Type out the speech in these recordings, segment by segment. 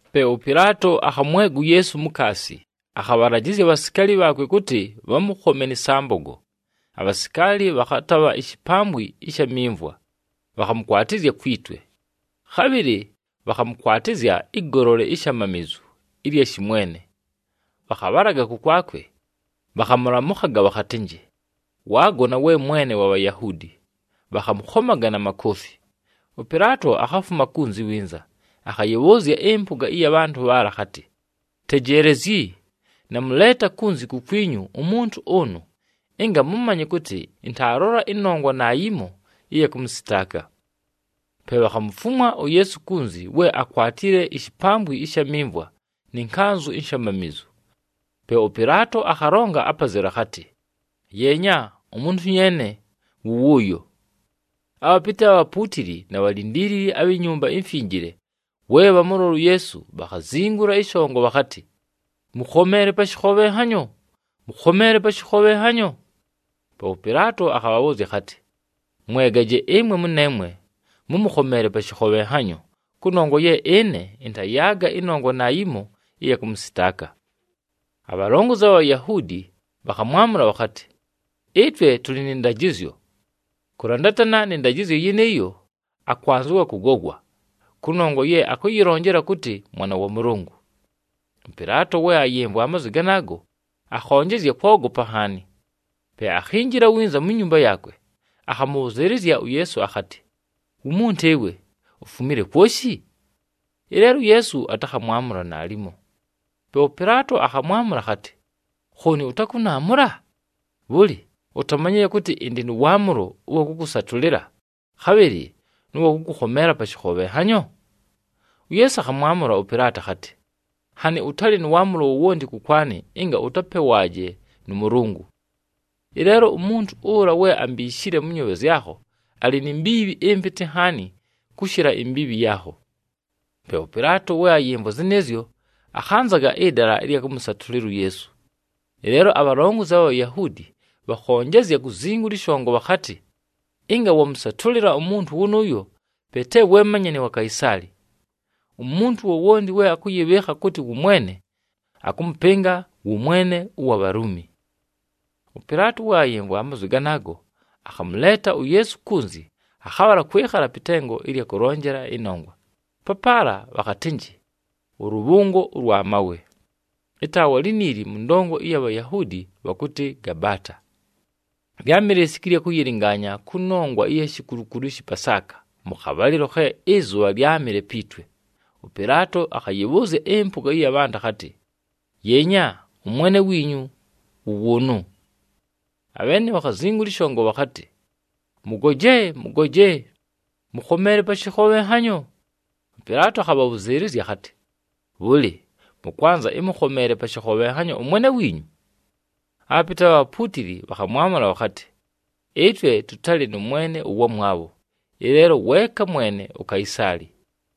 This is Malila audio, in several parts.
Pe ʉPɨlaato akhamwega uYeesu mukaasi, akhabhalajɨzya abhasikaali bhaakwe kʉtɨ bhamʉkhome nɨ sambogo. Abhasikaali bhakhatabha ishipambwi ɨsha mimvwa, bhakhamʉkwatɨzya kwi twe. Khabhɨlɨ bhakhamʉkwatɨzya ɨgolole ishamamizu ɨlya shɨmwene. Bhakhabhalaga kʉkwakwe, bhakhamʉlamʉkhaga bhakhatɨnjɨ, “Waagona, we Mwene wa Bhayahuudi!” Bhakhamʉkhomaga na makoofi. ɄPɨlaato akhafuma kunzi winza, akhayɨbhʉʉzya ɨmpʉga ɨya bhantʉ bhaala akhatɨ, “Tejeelezyi, namʉleeta kunzi kukwinyu umuntu ʉnʉ, ɨnga mʉmanye kʉtɨ ɨntaalola ɨnongwa naayimo ɨya kʉmʉsɨtaaka.” Pe bhakhamufumwa uYeesu kunzi we akwatile ishipambwi ɨsha mimvwa nɨ nkanzʉ inshamamizu. Pe ʉPɨlaato akhalonga apazelu akhatɨ, “Yeenya umuntu nyeene wʉ wʉʉyo.” Abhapɨtɨ abha bhapuutili na bhalindiilili abhi Nyumba iMfinjile we bhamʉlola uYeesu, bhakhazingula ɨshongo bhakhatɨ, “Mʉkhomeele pa shɨkhobhenhanyo, mʉkhomeele pa shɨkhobhenhanyo!” Pe ʉPɨlaato akhabhabhʉʉzya akhatɨ, “Mwegaje ɨmwe mʉneemwe, mʉmʉkhomeele pa shɨkhobhenhanyo, kʉnongwa ye ɨne ɨntayaaga ɨnongwa naayimo ɨya kʉmʉsɨtaaka.” Abhalongozi abha Bhayahuudi bhakhamwamʉla bhakhatɨ, “Ɨtwe tʉlɨ nɨ ndajɨzyo. Kʉlandatana nɨ ndajɨzyo yɨnɨɨyo, akwanzɨwa kʉgogwa, kʉnongwa ye akʉyɨlonjela kʉtɨ Mwana wa Mʉlʉngʉ.” ɄPɨlaato we ayɨmvwa amazwi ganaago, akhonjezya kwogopa nhaani. Pe akhinjila winza mu nyumba yaakwe, akhamʉbhʉzɨɨlɨzya uYeesu akhatɨ, “Wumuntu ɨwe, ufumile kwoshi?” Ɨleelo uYeesu atakhamwamʉla naalimo. Pe ʉPɨlaato akhamwamʉla akhatɨ, “Khooni ʉtakʉnaamʉla? Bhʉlɨ, utamanyile kʉtɨ ɨndɨ nʉ waamʉlo ʉwa kʉkʉsatʉlɨla, khabhɨlɨ nʉ wa kʉkʉkhomeela pa shɨkhobhenhanyo?” UYeesu akhamwamʉla ʉPɨlaato akhatɨ, “Nhanɨ ʉtalɨ nʉ waamʉlo wowonti kʉkwanɨ ɨnga ʉtapewaaje nʉ Mʉlʉngʉ. Ɨleelo umuntu ʉla we ambiishile mʉ nyoobhe zyakho, alɨ ni mbiibhi ɨmpɨtɨ nhaani kʉshɨla imbiibhi yaakho.” Pe ʉPɨlaato we ayɨmvwa zɨnɨɨzyo, akhanzaga ɨdala ɨlya kʉmʉsatʉlɨla uYeesu. Ɨleelo abhalongozi abha Bhayahuudi bhakhonjezya kuzingula ɨshongo bhakhatɨ, “Ɨnga wamʉsatʉlɨla umuntu wʉnʉʉyo, pe te we manyani wa Kaisaali. Umuntu wowonti we akʉyɨbhɨɨkha kʉtɨ wʉ mwene, akʉmʉpɨnga wʉ mwene ʉwa Bhaluumi.” ɄPɨlaato we ayɨmvwa amazwi ganaago, akhamʉleeta uYeesu kunzi, akhabhala kwɨkhala pɨ tengo ɨlya kʉlonjela ɨnongwa, papaala bhakhatɨnjɨ, “ɄLʉbhʉngo ʉlwa Mawe.” Ɨtaawa liniili mʉ ndongo ɨya Bhayahuudi bhakʉtɨ Gabaata. Lyámɨle lisiku ɨlya kʉyɨlɨngaanya kʉnongwa ɨya shikulukulu ɨshɨ Pasaaka mʉ khabhalɨlo khe ɨzʉbha lyámɨle pi twe. ɄPɨlaato akhayɨbhʉʉzya ɨmpʉga ɨya bhantʉ akhatɨ, “Yeenya, ʉmwene wiinyu wʉ wʉʉnʉ!” Abheene bhakhazingula ɨshongo bhakhatɨ, “Mʉgoje, mʉgoje! Mʉkhomeele pa shɨkhobhenhanyo!” ɄPɨlaato akhabhabhʉzɨɨlɨzya akhatɨ, “Bhʉlɨ, mʉkwanza ɨmʉkhomeele pa shɨkhobhenhanyo ʉmwene wiinyu?” Abhapɨtɨ abha bhapuutili bhakhamwamʉla bhakhatɨ, “Ɨtwe tʉtalɨ nʉ mwene ʉwamwabho, ɨleelo weeka mwene uKaisaali!”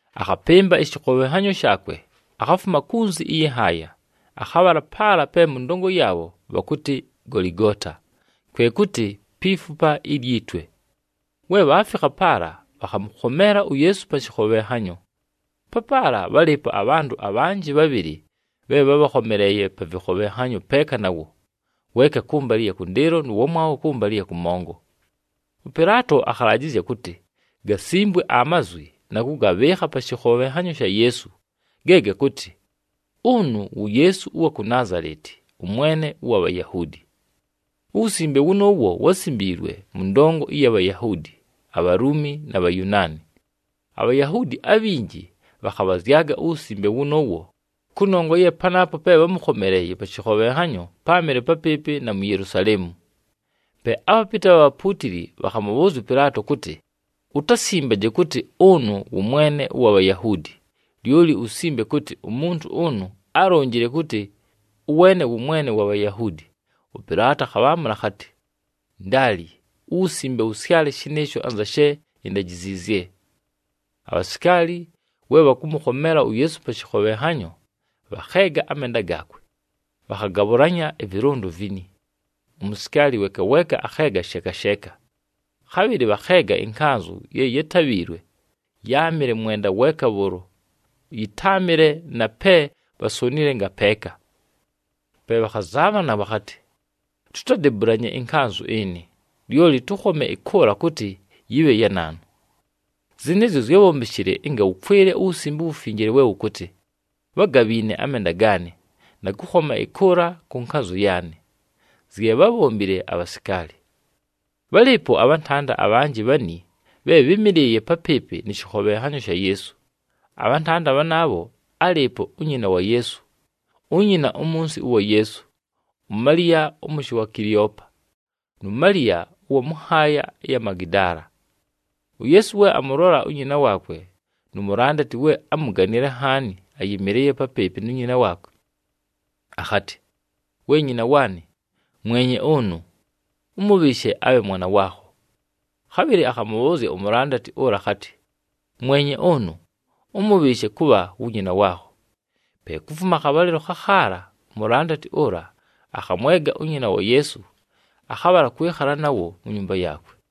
Akhapɨmba ɨshɨkhobhenhanyo shaakwe, akhafuma kunzi ɨyɨ nhaaya, akhabhala paala pe mʉ ndongo yaabho bhakʉtɨ Goligoota, kwe kʉtɨ, “Pi Fupa ilyi Twe.” We bhaafikha paala, bhakhamʉkhomeela uYeesu pa shɨkhobhenhanyo. Papaala bhálɨɨpo abhantʉ abhanjɨ bhabhɨlɨ bhe bhábhakhomeleeye pa vɨkhobhenhanyo peeka nawo, weeka kʉmbalɨ ɨya kʉndɨɨlo nʉ wamwabho kʉmbalɨ ɨya kʉmongo. ɄPɨlaato akhalajɨzya kʉtɨ gasimbwe amazwi na kʉgabhɨɨkha pa shɨkhobhenhanyo sha Yeesu, ge gakʉtɨ, “Ʉnʉ wu Yeesu ʉwa ku Naazaleti, ʉMwene ʉwa Bhayahuudi.” Uwusimbe wʉnʉʉwo wásimbiilwe mʉ ndongo ɨya Bhayahuudi, aBhaluumi, na Bhayunaani. ABhayahuudi abhinji bhakhabhazyaga uwusimbe wʉnʉʉwo, kʉnongwa ye panaapo pe bhámʉkhomeleeye pa shɨkhobhenhanyo, páamɨle papɨɨpɨ na mu Yelusaleemu. Pe abhapɨtɨ abha bhapuutili bhakhamʉbhʉʉzya ʉPɨlaato kʉtɨ, “Utasimbaje kʉtɨ, ‘Ʉnʉ wʉ Mwene ʉwa Bhayahuudi,’ lyoli usimbe kʉtɨ, ‘Umuntu ʉnʉ álonjile kʉtɨ, ʉweene wʉ Mwene wa Bhayahuudi.’” ɄPɨlaato akhabhaamʉla akhatɨ, “Ndaali, uwusimbe wʉsyale shɨnɨɨsho anza she indajiziizye.” Abhasikaali we bhamʉkhomeela uYeesu pa shɨkhobhenhanyo, bhakheega amenda gaakwe, bhakhagabhʉlanya ɨvɨlʉndo vini. Umusikaali weeka weeka akheega sheeka sheeka. Khabhɨlɨ bhakheega ɨnkanzʉ ye yátabhiilwe, yáamɨle mwenda weeka bhʉʉlo, yɨtáamɨle na pe bhasonile ngapeeka. Pe bhakhazaabhana bhakhatɨ, “Tutadebulanye ɨnkanzʉ ɨnɨ, lyoli tʉkhome ɨkʉʉla kʉtɨ yɨbhe ya naanu.” Zɨnɨɨzyo zyábhombeshile ɨnga wʉkwɨle uWusimbe uWufinjile we wʉkʉtɨ, “Bhágabhiine amenda gaanɨ, na kʉkhoma ɨkʉʉla kʉ nkanzʉ yaanɨ.” Zye bhábhombile abhasikaali. Bhálɨɨpo abhantanda abhanjɨ bhani bhe bhɨ́mɨlɨɨye papɨɨpɨ nɨ shɨkhobhenhanyo sha Yeesu. Abhantanda bhanaabho álɨɨpo unyina wa Yeesu, unyina umunsi ʉwa Yeesu, uMaliya ʉmʉshɨ wa Kileopa, nu Maliya ʉwa mʉ nhaaya ɨya mu Magidaala. UYeesu we amʉlola unyina waakwe, nu mulandati we ámuganile nhaani ayɨmɨlɨɨye papɨɨpɨ nu nyina waakwe, akhatɨ, “We nyina waanɨ, mwenye ʉnʉ. Ʉmʉbhɨɨshe abhe mwana waakho.” Khabhɨlɨ akhamʉbhʉʉzya umulandati ʉla akhatɨ, “Mwenye ʉnʉ. Ʉmʉbhɨɨshe kʉbha wu nyina waakho.” Pe kufuma akhabhalɨlo khakhaala umulandati ʉla akhamwega unyina wa Yeesu, akhabhala kwɨkhala nawo mu nyumba yaakwe.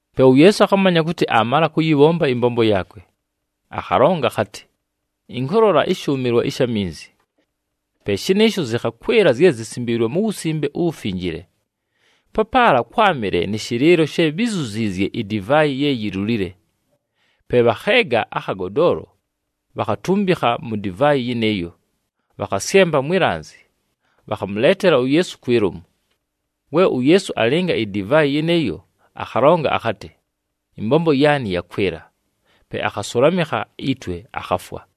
Pe uYeesu akhamanya kʉtɨ aamala kʉyɨbhomba ɨmbombo yaakwe. Akhalonga akhatɨ, “Ɨnkʉlola ɨshʉʉmɨlwa ɨsha minzi.” Pe shɨnɨɨsho zɨkhakwɨla zye zisimbiilwe mu Wusimbe uWufinjile. Papaala kwámɨle nɨ shɨlɨɨlo she bhizuziizye idivaayi ye yilulile. Pe bhakheega akhagodoolo bhakhatumbikha mu divaayi yɨnɨɨyo, bhakhasyempa mwi lanzi, bhakhamʉleetela uYeesu kwi lomu. We uYeesu alɨnga idivaayi yɨnɨɨyo, akhalonga akhatɨ, “Ɨmbombo yaanɨ yakwɨla!” Pe akhasʉlamɨkha itwe, akhafwa.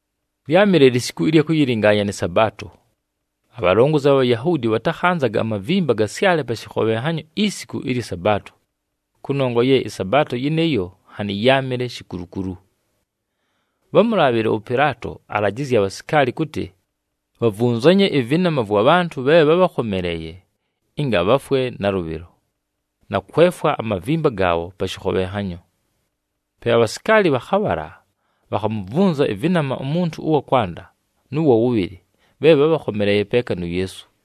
Lyámɨle lisiku ɨlya kʉyɨlɨngaanya nɨ Sabaato. Abhalongozi abha Bhayahuudi bhatakhanzaga amavimba gasyale pa shɨkhobhenhanyo isiku ɨlyɨ Sabaato, kʉnongwa ye ɨSabaato yɨnɨɨyo nhanɨ yáamɨle shikulukulu. Bhámulaabhile ʉPɨlaato, alajɨzye abhasikaali kʉtɨ bhavunzanye ɨvɨnama vwa bhantʉ bhe bhábhakhomeleeye ɨnga bhafwe nalʉbhɨlo, na kwefwa amavimba gaabho pa shɨkhobhenhanyo. Pe abhasikaali bhakhabhala, bhakhamuvunza ɨvɨnama umuntu ʉwa kwanda nʉ wa wʉbhɨlɨ bhe bhábhakhomeleeye peeka nu Yeesu.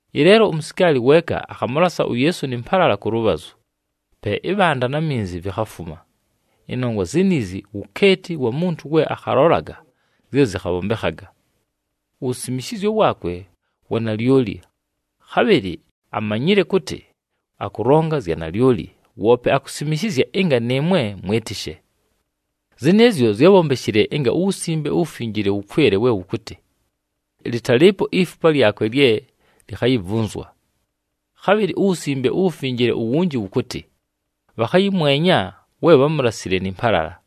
Ɨleelo umusikaali weeka akhamʉlasa uYeesu nɨ mpalala kʉ lʉbhazʉ, pe ɨbhanda na minzi vikhafuma. Ɨnongwa ziniizi wukeeti wa muntu we akhalolaga zye zɨkhabhombekhaga. Uwusimishizyo waakwe wa nalyoli, khabhɨlɨ amanyile kʉtɨ akʉlonga zya nalyoli, woope akusimishizya ɨnga nɨɨmwe mwɨtɨshe. Zɨnɨɨzyo zyábhombeshile ɨnga uWusimbe uWufinjile wʉkwɨle we wʉkʉtɨ, “Lɨtalɨɨpo ifupa lyakwe lye likhayivunzwa.” Khabhɨlɨ uWusimbe uWufinjile uwunji wʉkʉtɨ, “Bhakhayɨmwenya we bhámulasile nɨ mpalala.”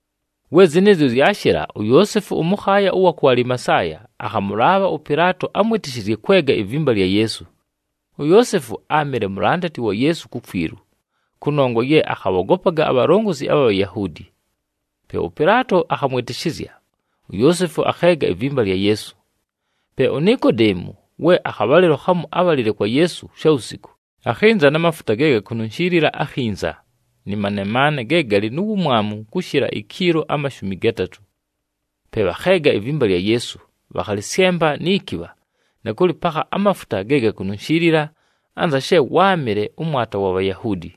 We zɨnɨɨzyo zyashɨla, uYoosefu ʉmʉkhaaya ʉwa ku Alimasaaya akhamʉlaabha ʉPɨlaato amwɨtɨshɨzye kwega ivimba lya Yeesu. UYoosefu áamɨle mulandati wa Yeesu kukwilu, kʉnongwa ye akhabhogopaga abhalongozi abha Bhayahuudi. Pe ʉPɨlaato, akhamwɨtɨshɨzya, uYoosefu akheega ivimba lya Yeesu. Pe uNikodeemu, we akhabhalɨlo khamu ábhalile kwa Yeesu shawusiku, akhɨnza na mafuta ge gakununshiilila akhinza, nɨ manemaane ge galɨ nu wumwamu kʉshɨla ikiilo amashumi gatatʉ. Pe bhakheega ivimba lya Yeesu, bhakhalɨsyempa ni kibha na kʉlɨpakha amafuta ge gakununshiilila anza she wáamɨle ʉmwata wa Bhayahuudi.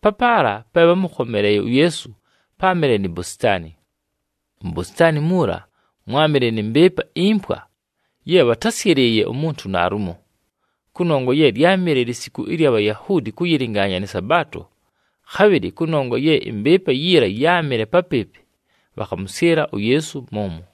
Papaala pe bhámʉkhomeleeye uYeesu páamɨle ni bositaani. Mu bositaani muula mwámɨle nɨ mbɨɨpa impwa ye bhatásyɨlɨɨye umuntu naalumo. Kʉnongwa ye lyámɨle lisiku ɨlya Bhayahuudi kʉyɨlɨngaanya nɨ Sabaato, khabhɨlɨ kʉnongwa ye ɨmbɨɨpa yiila yáamɨle papɨɨpɨ, bhakhamʉsyɨla uYeesu mʉmwo.